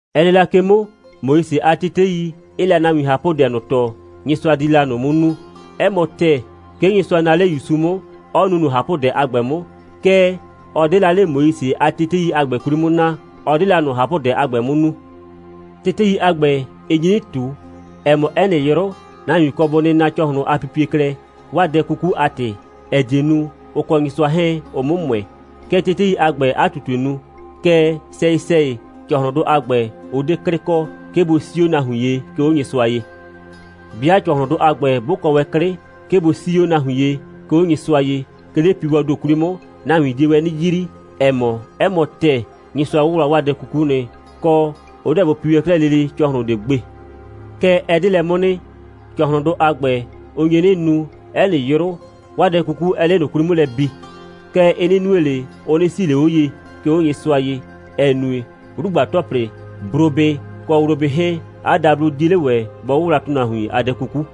Ɛ nɩ la ke 'mʋ, Moise a tetei 'ɩɩ la nahuin ꞊hapʋdɛ ꞊nʋ tɔɔ, Nyɩsʋa di la ꞊nʋ 'mʋ nu. 'Ɛ mɔ ‑tɛɛ, 'ke Nyɩsʋa naa 'le ‑Yusu 'mʋ, 'ɔ nu ꞊nʋ ꞊hapʋdɛ a ‑gbɛ 'mʋ. Kɛɛ, ɔ 'de la 'le Moise a tetei a ‑gbɛ 'kwli 'mʋ naa, ɔ 'de la ꞊nʋ ꞊hapʋdɛ a ‑gbɛ 'mʋ nu. Tetei a ‑gbɛ, ɩ nyi 'nɩ ꞊tu, ‑ɛ mɔ, 'ɛ nɩ 'yrʋ, nahuin kɔ bʋ nɩna ‑cɔhlʋn a pipie klɛ, 'waa dɛ 'kuku a ‑tɩ, ‑ɛ die nu, ʋ kɔ Nyɩsʋa 'hɛɛn, ʋ 'mʋ ‑mʋɛ. Kɛ tetei a ‑gbɛɛ 'a ꞊tutue nu. Kɛɛ, sɛyɩ‑sɛyɩ ‑cɔhlʋndʋ a ‑gbɛ, ʋ 'de 'klɩ kɔ, 'ke bʋ 'sii 'o nahuin ye, 'ke 'o Nyɩsʋa ye. 'Bɩa ‑cɔhlʋndʋ a ‑gbɛ 'bʋ kɔ wɛn 'klɩ, 'ke bʋ 'sii wɛn 'o nahuin ye, 'ke 'o Nyɩsʋa ye, 'ke 'le piiwɔɔ ‑do 'kwli 'mʋ, nahuin die wɛn 'nɩ yrii, ‑ɛ mɔ, 'ɛ mɔ ‑tɛɛ, Nyɩsʋa 'wʋwla 'waa dɛ 'kuku nɩ, kɔ, ʋ 'deɛ bʋ pi wɛn 'klɛɛ lele ‑cɔhlʋn ꞊de gbe. Kɛɛ, ɛ 'de lɛ 'mʋ nɩ. ‑Cɔhlʋndʋ a ‑gbɛ, ʋ nye 'nɩ nu, 'ɛ nɩ 'yrʋ, 'waa dɛ 'kuku 'ɛɛ 'le ꞊nʋ 'kwli 'mʋ lɛ bi. Kɛɛ, ɩ 'nɩ nue ꞊le, ʋ 'nɩ 'sii ꞊le 'o ye, 'ke 'o Nyɩsʋa ye, ‑ɛ nue, 'wlugba‑tɔplɩ, brobɩ kɔ wlobɩ 'hɛɛn, 'a dablo 'die 'le ‑wɛ bɔ 'wʋwla nahuin a dɛ 'kuku.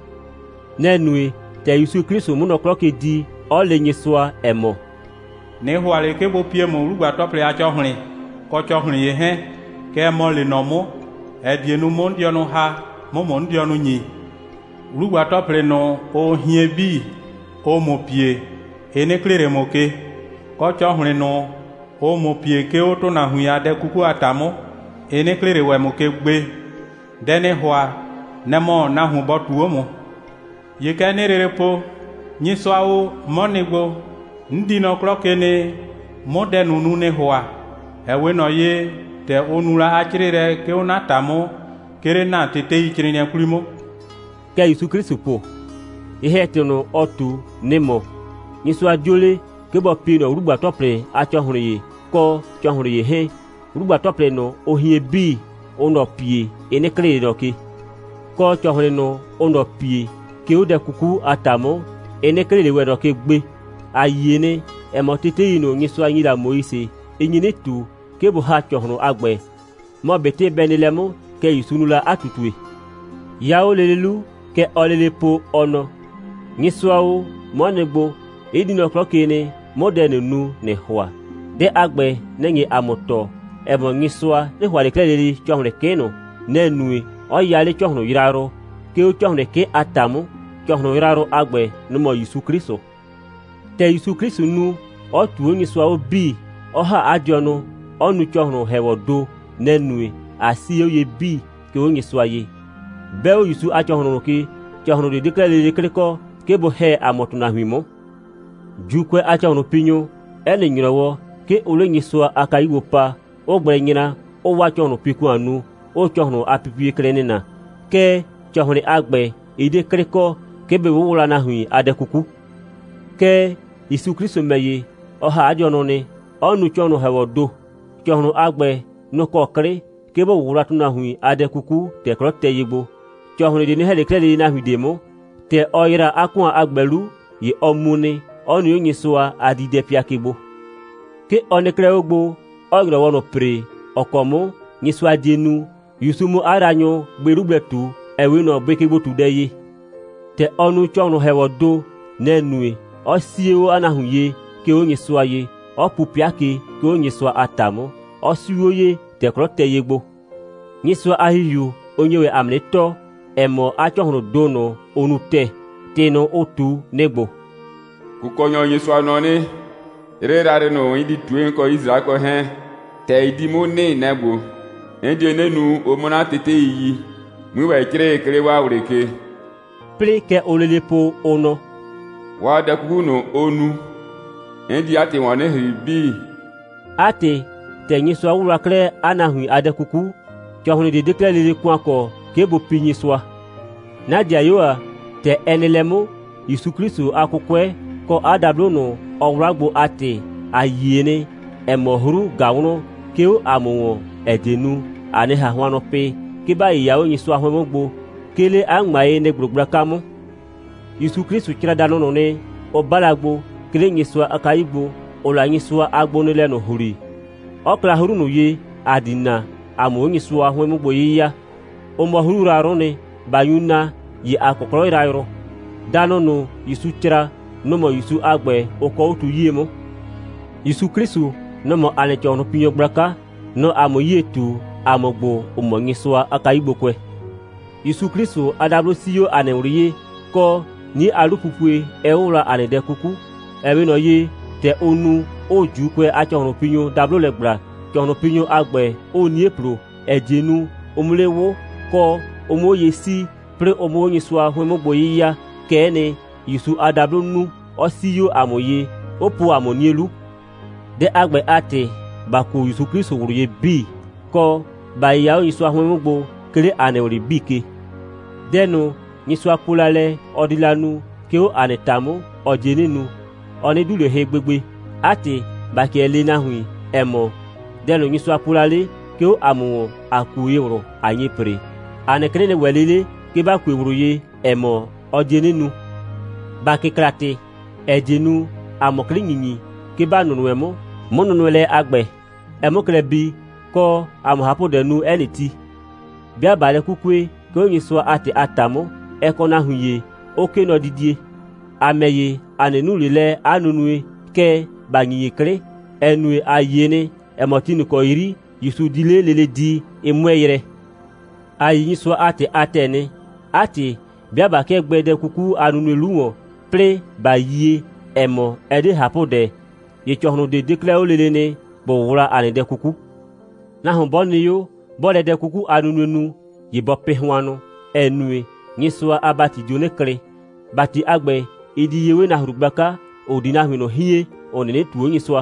Nɛ‑ nue, ‑tɛ ‑Yusu 'Klɩsʋ 'mʋ nɔ 'klɔ ke di, 'ɔ le Nyɩsʋa, ‑ɛ mɔ: «꞊Nɩ ‑hʋa ꞊le, 'ke bʋ pie ‑mʋ 'wlugba‑tɔplɩ a ‑cɔhlɩn, kɔ, ‑cɔhlɩn ‑ye 'hɛɛn. Kɛɛ, ‑mɔ lee nɔ 'mʋ, ‑ɛ die nu, 'mʋ 'n dɩɔnʋ ‑ha, 'mʋ ‑mʋ 'n dɩɔnʋ ‑nyi. 'Wlugba‑tɔplɩ ꞊nʋ, ʋʋ hien 'bii, ʋʋ ‑mʋ pie, ɩ 'nɩ klɩɩ ꞊le ‑mʋ ke. Kɔ, ‑cɔhlɩn ꞊nʋ, ʋʋ ‑mʋ pie, 'ke 'o ‑tʋnahuin a dɛ 'kuku a ‑ta 'mʋ, ɩ 'nɩ klɩɩ ꞊le ‑wɛ ‑mʋ ke gbe. Dɛ ‑nɩɩ ‑hʋa, nɛ‑ mɔ nahuon bɔ ꞊tuu 'o ‑mʋ. ‑Ye kɛ 'nɩɩ lele po: Nyɩsʋa o, 'mɔ nɩ gbo, 'n di nɔ 'klɔ ke nɩ, 'mʋ dɛ ꞊nʋ nu, ‑nɩɩ ‑hʋa, ‑ɛ 'we ꞊nɔ ye, ‑tɛ ʋ nu la 'a 'crɩɩlɛ, 'ke 'o 'na ‑ta 'mʋ, 'ke 'le ‑na teteicrɩɩnɩɛ 'kwli 'mʋ.» Kɛ ‑Yusu 'Klɩsʋ po. Ye‑hɛ‑tɩ ꞊nʋ, ɔ ꞊tu, nɩ‑ mɔ: Nyɩsʋa 'dio le, 'ke bɔ pie ꞊nɔ 'wlugba‑tɔplɩ a ‑cɔhlɩn kɔ, ‑cɔhlɩn ‑ye 'hɛɛn. 'Wlugba‑tɔplɩ ꞊nʋ, ʋʋ hien 'bii, ʋʋ ꞊nɔ pie, ɩ 'nɩ klɩɩ ꞊le ꞊nɔ ke. Kɔ, ‑cɔhlɩn ꞊nʋ, ʋʋ ꞊nɔ pie, 'ke 'o dɛ 'kuku a ‑ta 'mʋ, ɩ 'nɩ klɩɩ ꞊le ‑wɛ ꞊nɔ ke gbe. ‑A yie nɩ, ‑ɛ mɔ, tetei ꞊nʋ, Nyɩsʋa ‑nyi la Moise, ɩ nyi 'nɩ ꞊tu, 'ke bʋ ‑ha ‑cɔhlʋndʋ a ‑gbɛ. Mɔ ꞊betɩ bɛ nɩ lɛ 'mʋ, kɛ ‑Yusu nu la 'a ꞊tutue. 'Ya 'o lele 'lu, kɛ ɔɔ lele po, ɔ nɔ: «Nyɩsʋa o, 'mɔ nɩ gbo, 'n di nɔ 'klɔ ke nɩ, 'mʋ dɛ ꞊nʋ nu, ‑nɩɩ ‑hʋa.» Dɛ a ‑gbɛ, nɛ‑ nye ‑a mʋ tɔɔ, ‑ɛ mɔ, Nyɩsʋa 'nɩ ‑hʋa ꞊le 'klɛɛ lele ‑cɔhlɩn 'kɩ ꞊nʋ. Nɛ‑ nue, 'ɔ ya 'le ‑cɔhlʋn yrayrʋ, 'ke 'o ‑cɔhlɩn 'kɩ a ‑ta 'mʋ. ‑Cɔhlʋn yrayrʋ a ‑gbɛ, nʋ‑ mɔ ‑Yusu 'Klɩsʋ. ‑Tɛ ‑Yusu 'Klɩsʋ nu, 'ɔ ꞊tuu 'o Nyɩsʋa 'bii, 'ɔ ‑ha 'a dɩɔnʋ, 'ɔ nu ‑cɔhlʋn‑hɛɛwɔɔ ‑do, nɛ‑ nue, ꞊a 'sii 'o ye 'bii, 'ke 'o Nyɩsʋa ye. 'Bɛ ‑Yusu a ‑cɔhlʋn ꞊nʋ ke, ‑cɔhlʋn ꞊de 'de 'klɛɛ lele 'klɩ kɔ, 'ke bʋ ‑hɛ ‑a mʋ ‑tʋnahuin 'mʋ. ‑Juukʋɛ a ‑cɔhlʋnpinyʋ, 'ɛ nɩ ‑nyrɔwɔ, 'ke ʋʋ 'le Nyɩsʋa a kayu gbo pa, 'ʋʋ gblɛ nyra, 'ʋʋ 'waa ‑cɔhlʋnpi‑kʋan nu, 'ʋʋ ‑cɔhlʋn a pipie klɛ nɩna. Kɛɛ, ‑cɔhlɩn a ‑gbɛ, ɩ 'de 'klɩ kɔ, 'ke bɩ 'wʋwla nahuin a dɛ 'kuku. Kɛɛ, ‑Yusu 'Klɩsʋ ‑mɛ ‑ye, ɔ ‑ha 'a dɩɔnʋ nɩ, 'ɔ nu ‑cɔhlʋn‑hɛɛwɔɔ ‑do. ‑Cɔhlʋn a ‑gbɛ, nʋ‑ kɔ 'klɩ, 'ke bʋ 'wʋwla nahuin a dɛ 'kuku, ‑tɛ 'klɔ tɛ ye gbo. ‑Cɔhlɩn ꞊de 'nɩ ‑hɛ ꞊le 'klɛɛ lele nahuin ꞊de 'mʋ. ‑Tɛ ɔ ‑yra 'a ‑kʋan a ‑gbɛ 'lu, ‑ye ɔ mu nɩ, 'ɔ nɩ 'o Nyɩsʋa a diidɛpɩa ke gbo. 'Ke ɔ nɩ 'klɛɛ 'o gbo, 'ɔɔ ‑nyrɔwɔ ꞊nʋ ‑pre, ‑ɔ kɔ 'mʋ Nyɩsʋa die nu, ‑Yusu 'mʋ 'a yraanyʋ bʋɩ 'lu gblɛ ꞊tu, ‑ɛ 'we ꞊nɔ bʋɩkegbo꞊tudɛ ye. ‑Tɛ ɔ nu ‑cɔhlʋn‑hɛɛwɔɔ ‑do, nɛ‑ nue, 'ɔ 'sii 'o 'a nahuin ye, 'ke 'o Nyɩsʋa ye, 'ɔ pu 'pɩa ke, 'ke 'o Nyɩsʋa a ‑ta 'mʋ. Ɔ 'siu 'o ye, ‑tɛ 'klɔ tɛ ye gbo. Nyɩsʋa a ‑Hihiu, ʋ nye ‑wɛ ‑a mʋ 'nɩ tɔɔ, ‑ɛ mɔ, 'a ‑cɔhlʋʋn ‑do ꞊nʋ, ʋ nu ‑tɛɛ. ‑Tɩ ꞊nʋ, ʋ ꞊tu, nɩ‑ ‑gbo: «Kʋkɔnyɔ Nyɩsʋa nɔ 'nɩ: 'Yrɩ yrayrɩ ꞊nʋ, 'n di ꞊tue, 'n kɔ Yisraɛkʋɛ 'hɛɛn, ‑tɛ ɩ di 'mʋ nɩ, nɛ‑ ‑gbo: 'N die 'nɩ nu, ʋ 'mʋ 'na tetei yi, 'mui ‑wɛ 'crɩɩ, 'ke 'le 'waa ꞊wlɩ ke.» 'Plɩɩ, kɛ ʋʋ lele po, ʋ nɔ: «'Waa dɛ 'kuku ꞊nʋ, ʋ nu, 'n di 'a ‑tɩ ‑wɔn 'nɩ ‑hri 'bii.» 'A ‑tɩ, ‑tɛ Nyɩsʋa 'wʋwla 'klɛɛ 'a nahuin a dɛ 'kuku, ‑cɔhlɩn ꞊de 'de 'klɛɛ lele ‑kʋan kɔ, 'ke bʋ pii Nyɩsʋa. 'Na ‑dɩayuo ‑a, ‑tɛ ɛ nɩ lɛ 'mʋ, ‑Yusu 'Klɩsʋ a 'kʋkʋɛ kɔ 'a dablo ꞊nʋ, ɔ 'wla gbo a ‑tɩ, ‑a yie nɩ, ‑ɛ mɔ, 'hru ꞊ga wlɔn, 'ke 'o ‑a mʋ ‑wɔn, ‑ɛ die nu, ‑a 'nɩ ꞊han hʋannʋ pɩ, 'ke ‑ba 'yɩya 'o Nyɩsʋa 'hʋɩn 'mʋ gbo, 'ke 'le 'a ‑ŋmayenɩ‑gblo gblaka 'mʋ. ‑Yusu 'Klɩsʋ cra danʋ ꞊nʋ nɩ, ʋ 'ba la gbo, 'ke 'le Nyɩsʋa a kayu gbo, ‑ʋʋ la Nyɩsʋa a gbonɩɩlɛ ꞊nʋ ‑hli, 'ɔ kla 'hru ꞊nʋ ye, ‑a di na, ‑a 'mʋ 'o Nyɩsʋa 'hʋɩn 'mʋ gbo 'yɩya. Ʋ mɔ 'hru yrayrʋ'ʋ nɩ. ꞊Ba nyu na, ‑ye ‑a kɔ 'klɔ yrayrʋ. Danʋ ꞊nʋ, ‑Yusu cra, nʋ‑ mɔ ‑Yusu a ‑gbɛ, ʋ kɔɔ 'o tu 'yie 'mʋ. ‑Yusu 'Klɩsʋ, nɔ‑ mɔ ‑a nɩ ‑cɔhlʋnpinyɔ gblaka. Nɔ‑ɔ ‑a mʋ 'yie ꞊tu, ‑a mʋ ‑gbo, ‑ʋ mɔ Nyɩsʋa a kayugbokʋɛ. ‑Yusu 'Klɩsʋ a dablo 'sii 'o ‑a nɩ ꞊wlɩ ye, kɔ, 'nie a 'lupupue 'ɛ 'wʋwla ‑a nɩ dɛ 'kuku. Ɛ 'we ꞊nɔ ye, ‑tɛ ʋʋ nu, 'ʋʋ ‑Juukʋɛ a ‑cɔhlʋnpinyʋ dablo lɛ ‑gbla, ‑cɔhlʋnpinyʋ a ‑gbɛ 'ʋʋ 'nie ‑plo, ‑ɛ die nu, ʋ 'mʋ 'le 'wʋ, kɔ, ʋ 'mʋ 'o ye 'sii, 'plɩɩ ʋ 'mʋ 'o Nyɩsʋa 'hʋɩn 'mʋ gbo 'yɩya, kɛ'ɛ nɩ, ‑Yusu a dablo nu, 'ɔ 'sii 'o ‑a mʋ ye, 'ʋ po ‑a mʋ 'nie 'lu. Dɛ a ‑gbɛ a ‑tɩ, ‑ba kuo ‑Yusu 'Klɩsʋ ꞊wlʋ ye 'bii, kɔ, ‑ba 'yɩya 'o Nyɩsʋa 'hʋɩn 'mʋ gbo, 'ke 'le ‑a nɩ ꞊wlɩ 'bii ke. Dɛ ꞊nʋ, Nyɩsʋa po la lɛ, ɔ di la nu, 'ke 'o ‑a nɩ ‑ta 'mʋ, ɔ die 'nɩ nu. Ɔ 'nɩ 'du ꞊le hɩ lɛ gbegbe. 'A ‑tɩ, ‑ba 'kɩɛ lee nahuin, ‑ɛ mɔ, dɛ ꞊nʋ, Nyɩsʋa po la 'le, 'ke 'o ‑a mʋ ‑wɔn, ‑a kue ye ꞊wlʋ, ꞊a nye ‑pre. ‑A nɩ 'klɩ nɩ ‑wɛ 'le 'le, 'ke ‑ba kue ꞊wlʋ ye, ‑ɛ mɔ, ɔ die 'nɩ nu. ‑Ba kɩkla ‑tɩ, ‑ɛ die nu, ‑a 'mʋ 'klɩ ‑nyinyi, 'ke ‑ba nʋnʋɛ 'mʋ, 'mʋnʋnʋɛlɛ a ‑gbɛ, ɛ 'mʋ klɛ bii, kɔ, ‑a 'mʋ ꞊hapʋdɛ nu 'ɛ nɩ ti. 'Bɩa ꞊baa lɛ 'kukue, 'ke 'o Nyɩsʋa a ‑tɩ a ‑ta 'mʋ, ɛ kɔ nahuin ‑ye, 'ʋ 'kee nɔdidie. ‑A ‑mɛ ‑ye, ‑a 'nɩ nu 'le lɛ 'a nunue, kɛɛ, ‑ba ‑nyinyi 'klɩ, ‑ɛ nue, a yie nɩ, ‑ɛ mɔ, ti ꞊nʋ ‑kɔ 'yri ‑Yusu di 'le lele di, ɩ 'mʋɛɛ yrɛ. ‑A yi Nyɩsʋa a ‑tɩ a ‑tɛɛ nɩ. 'A ‑tɩ, 'bɩa ꞊ba 'kɩɛ gbɛɛ dɛ 'kuku a nunue 'lu ‑wɔn, 'plɩɩ ꞊ba yie, ‑ɛ mɔ, ɛ 'de ꞊hapʋdɛ, ‑ye ‑cɔhlʋn ꞊de 'de 'klɛɛ 'o lele nɩ, ‑bʋ 'wʋwla ‑a nɩ dɛ 'kuku. Nahuon 'bɔ nɩ 'o, 'bɔɔ lɛ dɛ 'kuku a nunue nu, ‑ye bɔ pɩ hʋannʋ, ‑ɛ nue, Nyɩsʋa a ‑bati dio 'nɩ klɩ. ‑Bati a ‑gbɛ, ɩ di ye 'we nahru gblaka, ‑ʋ di nahuin ꞊nʋ hien, ‑ʋ 'nɩnɩ ꞊tuu 'o Nyɩsʋa.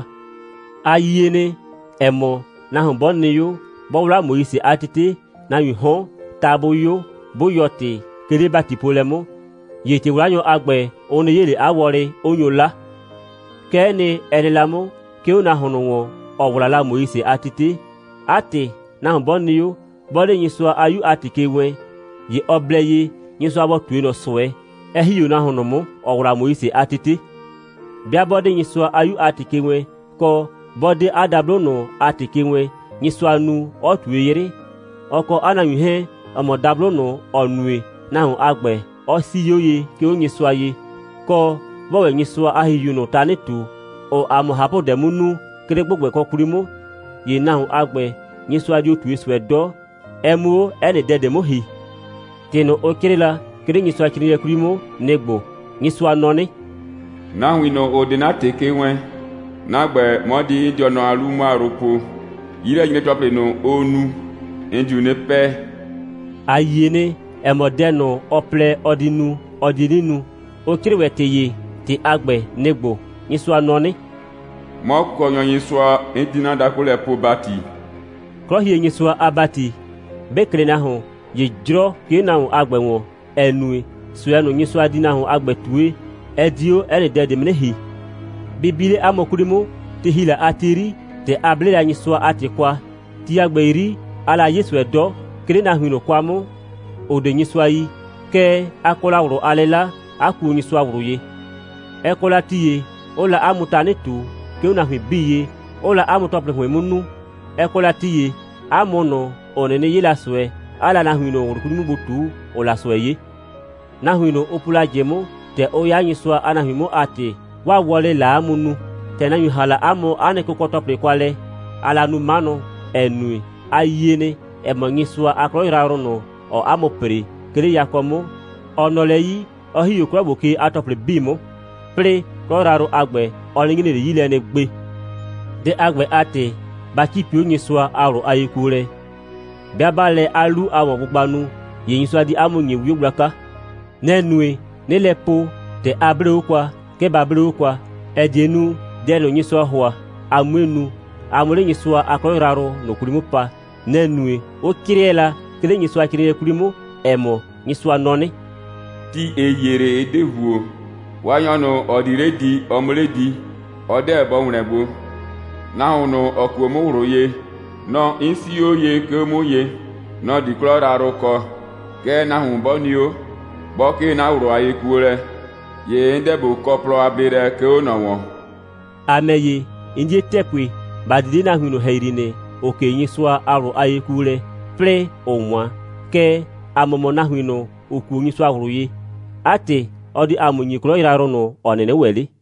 A yie nɩ, ‑ɛ mɔ, nahuon 'bɔ nɩ 'o, 'bɔ 'wla Moise a tete, nahuiin 'hɔn, ta 'bʋ 'yo, 'bʋ yɔɔ ‑tɩ, 'ke 'le ‑batipoolɛ 'mʋ, ‑ye ‑tɩ'wlanyɔ a ‑gbɛ, ʋ 'nɩ 'ye ꞊le 'a wɔlɩ, 'ʋ nyo 'la. Kɛ'ɛ nɩ, ɛ nɩ la 'mʋ, 'ke 'o nahuon ꞊nʋ ‑wɔn, ‑ɔ 'wla la Moise a tete. 'A ‑tɩ, nahuon 'bɔ nɩ 'o, 'bɔ 'de Nyɩsʋa a 'Yu a ‑tɩ ke wɛɛn, ‑ye ɔ blɛ ye, Nyɩsʋa bɔ ꞊tue ꞊nɔ ꞊sʋɛ, 'ɛ ‑hi 'o nahuon ꞊nʋ 'mʋ, ‑ɔ 'wla Moise a tete. 'Bɩa 'bɔ 'de Nyɩsʋa a 'Yu a ‑tɩ ke wɛɛn, kɔ, 'bɔ 'de 'a dablo ꞊nʋ a ‑tɩ ke wɛɛn, Nyɩsʋa nu, 'ɔ ꞊tue 'yrɩ, ɔ kɔ 'a nahuin 'hɛɛn, ‑ɔ mɔ dablo ꞊nʋ, ‑ɔ nue, nahuon a ‑gbɛ, 'ɔ 'sii 'o ye, 'ke 'o Nyɩsʋa ye, kɔ, 'bɔɔ ‑wɛ Nyɩsʋa a ‑Hihiu ꞊nʋ tanɩ ꞊tu, ‑ʋʋ ‑a mʋ ꞊hapʋdɛ 'mʋ nu, 'ke 'le ‑gbʋgbɛkɔ 'kwli 'mʋ, ‑ye nahuon a ‑gbɛ, Nyɩsʋa dio ꞊tue ꞊sʋɛ 'dɔ, ɛ 'mʋ 'o 'ɛ nɩ dɛ ꞊de 'mʋ ‑hi. ‑Tɩ ꞊nʋ, ʋ 'crɩɩ la, 'ke 'le Nyɩsʋacrɩɩnɩɛ 'kwli 'mʋ, nɩ‑ ‑gbo: «Nyɩsʋa nɔ 'nɩ: Nahuin ꞊nʋ, ‑ʋ 'de 'na ‑tɩ ke wɛɛn, 'na ‑gbɛ, 'mɔ di 'n dɩɔnʋ a 'lu 'mʋ a yrʋ po. 'Yilɛnyre‑tɔplɩ ꞊nʋ, ʋʋ nu, 'n diu 'nɩ 'pɛɛ.» ‑A yie nɩ, ‑ɛ mɔ, dɛ ꞊nʋ, ɔ plɛ, ɔ di nu, ɔ die 'nɩ nu. Ʋ 'crɩɩ ‑wɛ ‑tɩ ‑ye. ‑Tɩ a ‑gbɛ, nɩ‑ ‑gbo: «Nyɩsʋa nɔ 'nɩ: 'Mɔ Kʋkɔnyɔ Nyɩsʋa, 'n di 'na dakʋ lɛ poo ‑bati.» 'Klɔhienyɩsʋa a ‑bati, 'bɩ klɩ nahuon, ‑ye 'jrɔ 'ke 'o nahuon a ‑gbɛ ‑wɔn, ‑ɛ nue, ꞊sʋɛ ꞊nʋ, Nyɩsʋa di nahuon a ‑gbɛ ꞊tue, ɛ di 'o 'ɛ nɩ dɛ ꞊de 'mʋ 'nɩ ‑hi. Bɩ bi 'le 'a mʋ 'kwli 'mʋ, ti ‑hi la a ti 'yri, ‑tɛ a 'ble la Nyɩsʋa a ‑tɩ kwa, ti a ‑gbɛ 'yri, aa la 'ye ꞊sʋɛ 'dɔ, 'ke 'le nahuin ꞊nʋ kwa 'mʋ, ‑ʋ 'de Nyɩsʋa yi. Kɛɛ, a kɔ la ꞊wlʋ a 'lɩla, 'a kuo Nyɩsʋa ꞊wlʋ ye. Ɛ kɔ la ti ‑ye, 'ʋʋ la 'a mʋ tanɩ ꞊tu, 'ke 'o nahuin 'bii ye, 'ʋʋ la 'a mʋ ‑tɔplɩ ‑hʋɩn 'mʋ nu, 'ɛ kɔ la ti ‑ye, 'a mʋ ꞊nʋ, ‑ʋ 'nɩnɩ 'ye la ꞊sʋɛ, 'aa la nahuin ꞊nʋ ꞊wlʋ 'kwli 'mʋ gbo ꞊tu, ‑ʋʋ la ꞊sʋɛ 'ye. Nahuin ꞊nʋ, ʋ po la ꞊jɩ 'mʋ, ‑tɛ ʋ 'ya Nyɩsʋa a nahuin 'mʋ a ‑tɩ, 'waa wɔlɩ‑ɩ la 'a mʋ nu. ‑Tɛ nahuin ‑ha la 'a mʋ 'a nɩ kʋkɔ‑tɔplɩ kwa lɛ, aa la nu 'manʋ, ‑ɛ nue, a yie nɩ, ‑ɛ mɔ, Nyɩsʋa a 'klɔ yrayrʋ ꞊nʋ, ‑ɔɔ 'a mʋ ‑pre, 'ke 'le yakɔ 'mʋ, ɔ nɔ lɛ 'yi, 'ɔ ‑hi 'o 'klɔ ‑gbo ke a ‑tɔplɩ 'bii 'mʋ, 'plɩɩ 'klɔ yrayrʋ a ‑gbɛ, ɔ 'nɩ nyre ꞊le 'yi lɛ nɩ gbe. Dɛ a ‑gbɛ a ‑tɩ, ba 'cipi 'o Nyɩsʋa a ꞊wlʋ a yekuolɛ. 'Bɩa 'baa lɛ 'a 'lu a ‑wɔngbʋgba nu, ‑ye Nyɩsʋa di 'a mʋ ‑nye 'wio gblaka. Nɛ‑ nue, 'nɩɩ lɛ po, ‑tɛ a 'blee 'o kwa, 'ke ba 'blee 'o kwa, ‑ɛ die nu, dɛ ꞊nʋ, Nyɩsʋaa ‑hʋa, a 'mue nu, a 'mʋ 'le Nyɩsʋa a 'klɔ yrayrʋ ꞊nʋ 'kwli 'mʋ pa. Nɛ‑ nue, 'ʋ 'crɩɛ la, 'ke 'le Nyɩsʋacrɩɩnɩɛ 'kwli 'mʋ, ‑ɛ mɔ: «Nyɩsʋa nɔ 'nɩ: Ti ‑ɩ hie 'le, ɩ 'de ‑huo, Waanyɔ ꞊nʋ, ‑ɔ di 'le di, ɔ 'mʋ 'le di. Ɔ 'deɛ bɔ ‑wlɛn gbo. Nahuon ꞊nʋ, ‑ɔ kuo 'mʋ ꞊wlʋ ye, nɔ‑ 'n 'sii 'o ye, 'ke 'o 'mʋ ye, nɔ‑ di 'klɔ yrayrʋ kɔ. Kɛɛ, nahuon 'bɔ nɩ 'o, 'bɔ 'kee 'na ꞊wlʋ a yekuolɛ, ‑ye 'n 'deɛ ꞊bo kɔ plɔ a bleelɛ, 'ke 'o ꞊nɔ ‑wɔn.» ‑A ‑mɛ ‑ye, 'n 'die ‑tɛɛ pue, ‑ba di 'le nahuin ꞊nʋ ‑hɛyri nɩ, ‑ʋ 'kee Nyɩsʋa a ꞊wlʋ a yekuolɛ, 'plɩɩ ‑ʋʋ 'wan. Kɛɛ, ‑a mʋ mɔ nahuiin ꞊nʋ, ‑ʋ kuo Nyɩsʋa ꞊wlʋ ye. 'A ‑tɩ, ɔ di ‑a mʋ ‑nyi 'klɔ yrayrʋ ꞊nʋ, ‑ɔ 'nɩnɩ ‑wɛ 'le.